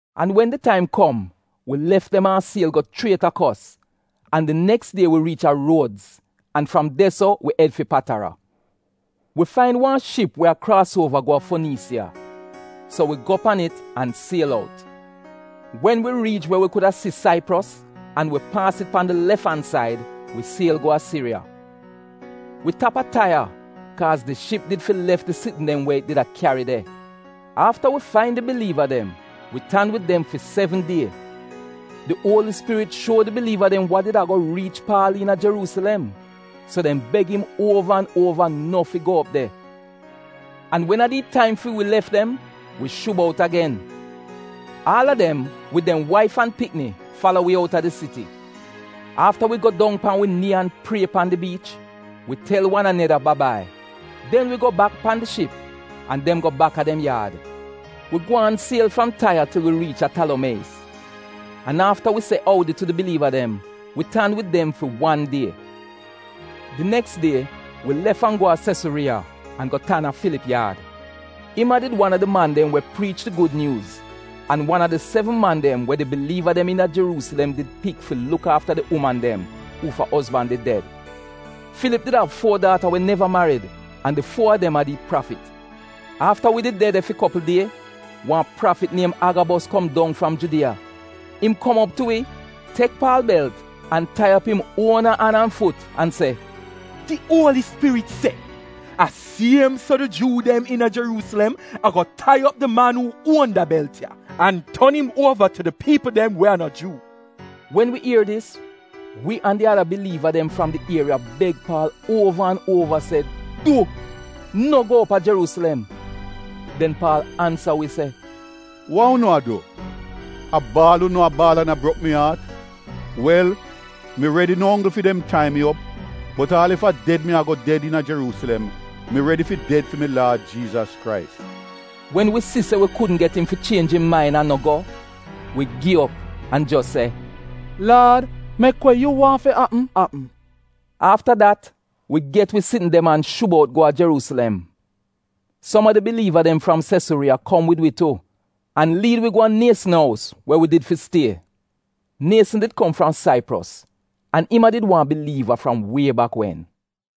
An wen di taim kom wi lef dem a siel go chriet a Kos, an di neks die wi riich a Ruodz an fram de so wi ed fi Patara. Wi fain wan ship we a kraas uova go a Foniisiya, so wi go pan it an siel out. Wen wi riich we wi kuda si Saipros, an wi paas it pan di lef said, wi siel go a Siriya. Wi tap a Taiya, kaaz di ship did fi lef di sitn dem we it did a kyari de. Afta wi fain di biliiva dem, wi tan wid dem fi sevn die. Di Uoli Spirit shuo di biliiva dem wa did ago riich Paal iina Jeruusilem, so dem beg im uova an uova no fi go op de. An wen a di taim fi wi lef dem, wi shub out agen. Aal a dem wid dem waif an pikni fala wi outa di siti. Afta wi go dong pan wi nii an prie pan di biich, wi tel wan aneda ba-bai. Den wi go bak pan di ship an dem go bak a dem yaad. Wi gwaan siel fram Taiya til wi riich a Talomieyis. An afta wi se oudi tu di biliiva dem, wi tan wid dem fi wan die. Di neks die wi lef an go a Sesuriiya an go tan a Filip yaad. Im a did wan a di man dem wi priicha di Gud Nyuuz, an wan a di sevn man dem we di biliiva dem iina Jeruusilem did pik fi luk aafa di uman dem uufa ozban did ded. Filip did av fuo daata we neva, marid an di fuo a dem a did prafit. Afta wi did de de fi kopl die, wan prafit niem Agabos kom dong fram Judiya. Im kom op tu wi, tek Paal belt, an tai op im uona an an fut an se, “Di Uoli Spirit se, ‘A siem so di Juu dem iina Jeruusilem ago tai op di man uu uon da belt ya, an ton im uova tu di piipl dem we a no Juu.’” Wen wi ier dis, wi an di ada biliiva dem fram di ieriya beg Paal uova an uova se, “Du! No go op a Jeruusilem.” Den Paal ansa dem se, “Wa unu a du, a baal unu a baal an a brok mi aat? Wel, mi redi no onggl fi dem tai mi op bot aal ef a ded mi ago ded iina Jeruusilem mi redi fi ded fi mi Laad Jiizas Krais.” Wen wi si se wi kudn get im fi chienj im main an no go, wi gi op an jos se, “Laad, mek we yu waahn fi apm apm!” Afta dat wi get wi sitn dem an shub out go a Jeruusilem. Som a di biliiva dem fram Sesuriiya kom wid wi tu an liid wi go a Nieson ous we wi did fi stie. Nieson did kom fram Saipros an im a did wan biliiva fram wie bak wen.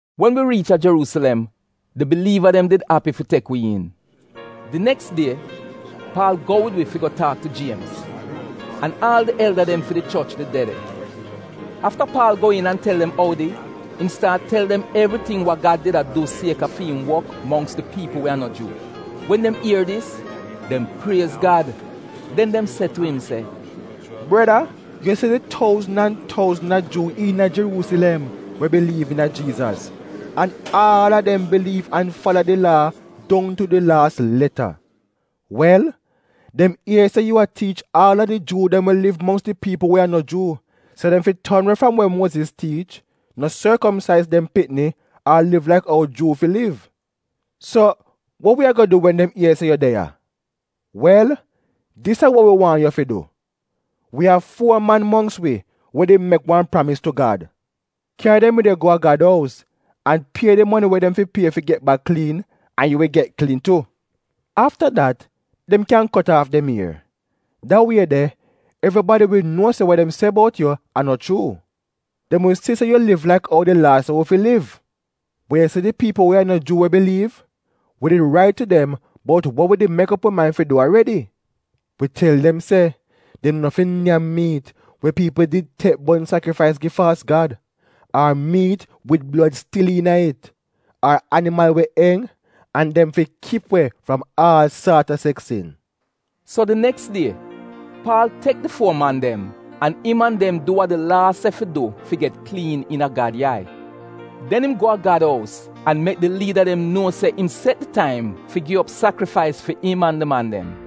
Wen wi riich a Jeruusilem, di biliiva dem did api fi tek wi iin. Di neks die Paal go wid wi fi go taak tu Jiemz, an aal di elda dem fi di choch did de de. Afta Paal go iin an tel dem oudi, im staat tel dem evriting wa Gad did a du chuu fi im wok mongks di piipl we a no Juu. Wen dem ier dis, dem priez Gad. Den dem se tu im se, “Breda, yu si di touzn an touzn a Juu iina Jeruusilem we biliiv iina Jiizas, an aal a dem biliiv an fala di Laa dong tu di laas leta. Wel, dem ier se yu a tiich aal a di Juu dem we liv mongks di piipl we a no Juu se dem fi ton we fram we Muoziz tiich, an se dem no fi sorkomsaiz dem pikni, ar liv laik ou Juu fi liv. So, wa wi ago du wen dem ier se yu de ya? Wel, dis a wa wi waahn yu fi du: wi av fuo man mongks wi we did mek wan pramis tu Gad, kyari dem wid yu go a Gad ous an pie di moni we dem fi pie fi get bak kliin, an yu wi get kliin tu. Afta dat dem kyan kot aaf dem ier. Da wie de evribadi wi nuo se wa dem se bout yu a no chuu. Dem wi si se yu liv laik ou di Laa se wi fi liv. Bot yu si di piipl we a no Juu we biliiv, wi did rait tu dem bout wa wi did mek op wi main fi du aredi. Wi tel dem se dem no fi nyam miit we piipl did tek mek sakrifais gi faalz gad, ar miit wid blod we stil iina it, an animal we enj, an dem fi kip we fram aal saat a seks sin.” So di neks die, Paal tek di fuo man dem an im an dem du wa di laa se fi du fi get kliin iina Gad yai. Den im go a Gad ous an mek di liida dem nuo se im set di taim fi gi op sakrifais fi im an di man dem.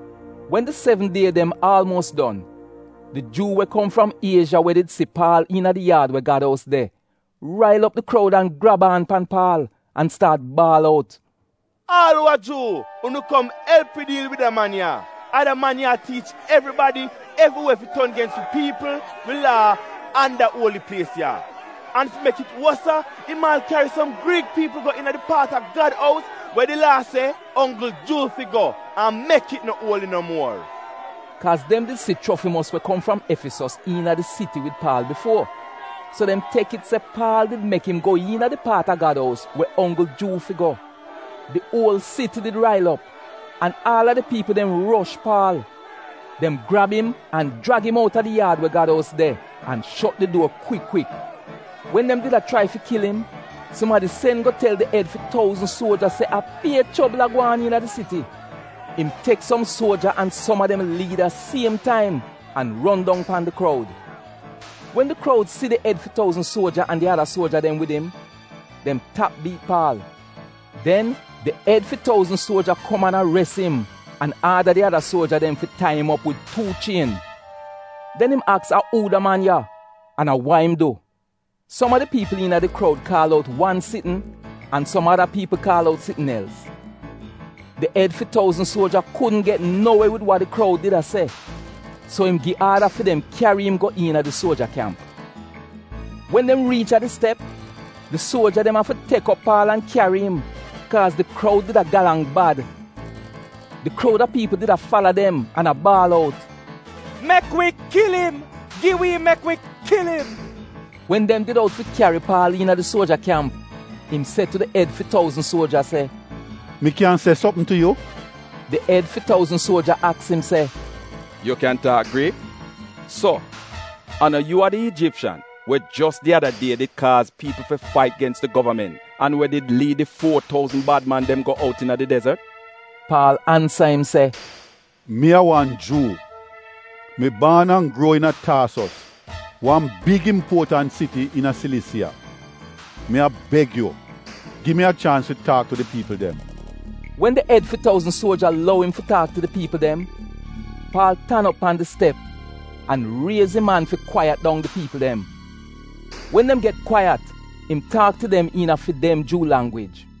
Wen di sevn die dem aalmuos don, di Juu we kom fram Iezha we did si Paal iina di yaad we Gad ous de rail op di kroud an grab aan pan Paal, an staat baal out, “Aal uu a Juu, unu kom elp wi diil wid da man ya! A da man ya a tiich evribadi evriwe fi ton gens wi piipl, wi Laa, an da uoli plies ya! An fi mek it wosa, im aal kyari som Griik piipl go iina di paat a Gad ous we di Laa se onggl Juu fi go, an mek it no uoli no muor. Dem se dis kaaz dem did si Chrofimos we kom fram Efisos iina di siti wid Paal bifuo, so dem tek it se Paal did mek im go iina di paat a Gad ous we onggl Juu fi go. Di uol siti did rail op, an aal a di piipl dem rosh Paal. Dem grab im an jrag im outa di yaad we Gad ous de, an shot di duor kwik kwik. Wen dem did a chrai fi kil im, sumadi sen go tel di ed fi touzn suoja se a pie chobl a gwaan iina di siti. Im tek som suoja an som a dem liida siem taim an ron dong pan di kroud. Wen di kroud si di ed fi touzn suoja an di ada suoja dem wid im, dem tap biit Paal. Den di ed fi touzn suoja kom an ares im an aada di ada suoja dem fi tai im op wid tuu chien. Den im aks a uu da man ya an a wa im du. Som a di piipl iina di kroud kaal out wan sitn an som ada piipl kaal out sitn els. Di ed fi touzn suoja kudn get no we wid wa di kroud did a se, so im gi aada fi dem kyari im go iina di suoja kyamp. Wen dem riich a di step, di suoja dem afi tek op Paal an kyari im kaaz di kroud did a galang bad. Di kroud a piipl did a fala dem an a baal out, “Mek wi kil im! Gi wi im mek wi kil im!” Wen dem did out fi kyari Paal iina di suoja kyamp im se tu di ed fi touzn suoja se, “Mi kyan se sopm tu yu?” Di ed fi touzn suoja aks im se “Yu kyan taak Griik? So a no yu a di Ijipshan we jos di ada die did kaaz piipl fi fait gens di govament an we did liid di fuo touzn bad man dem go out iina di dezot?” Paal ansa im se, “Mi a wan Juu. Mi baan an gruo iina Taasos wan big impuotant siti iina Silisiya. Mi a beg yu, gi mi a chaans fi taak tu di piipl dem.” Wen di ed fi touzn suoja lou im fi taak tu di piipl dem, Paal tan op pan di step an raiz im an fi kwaiyat dong di piipl dem. Wen dem get kwaiyat im taak tu dem iina fi dem Juu langwij.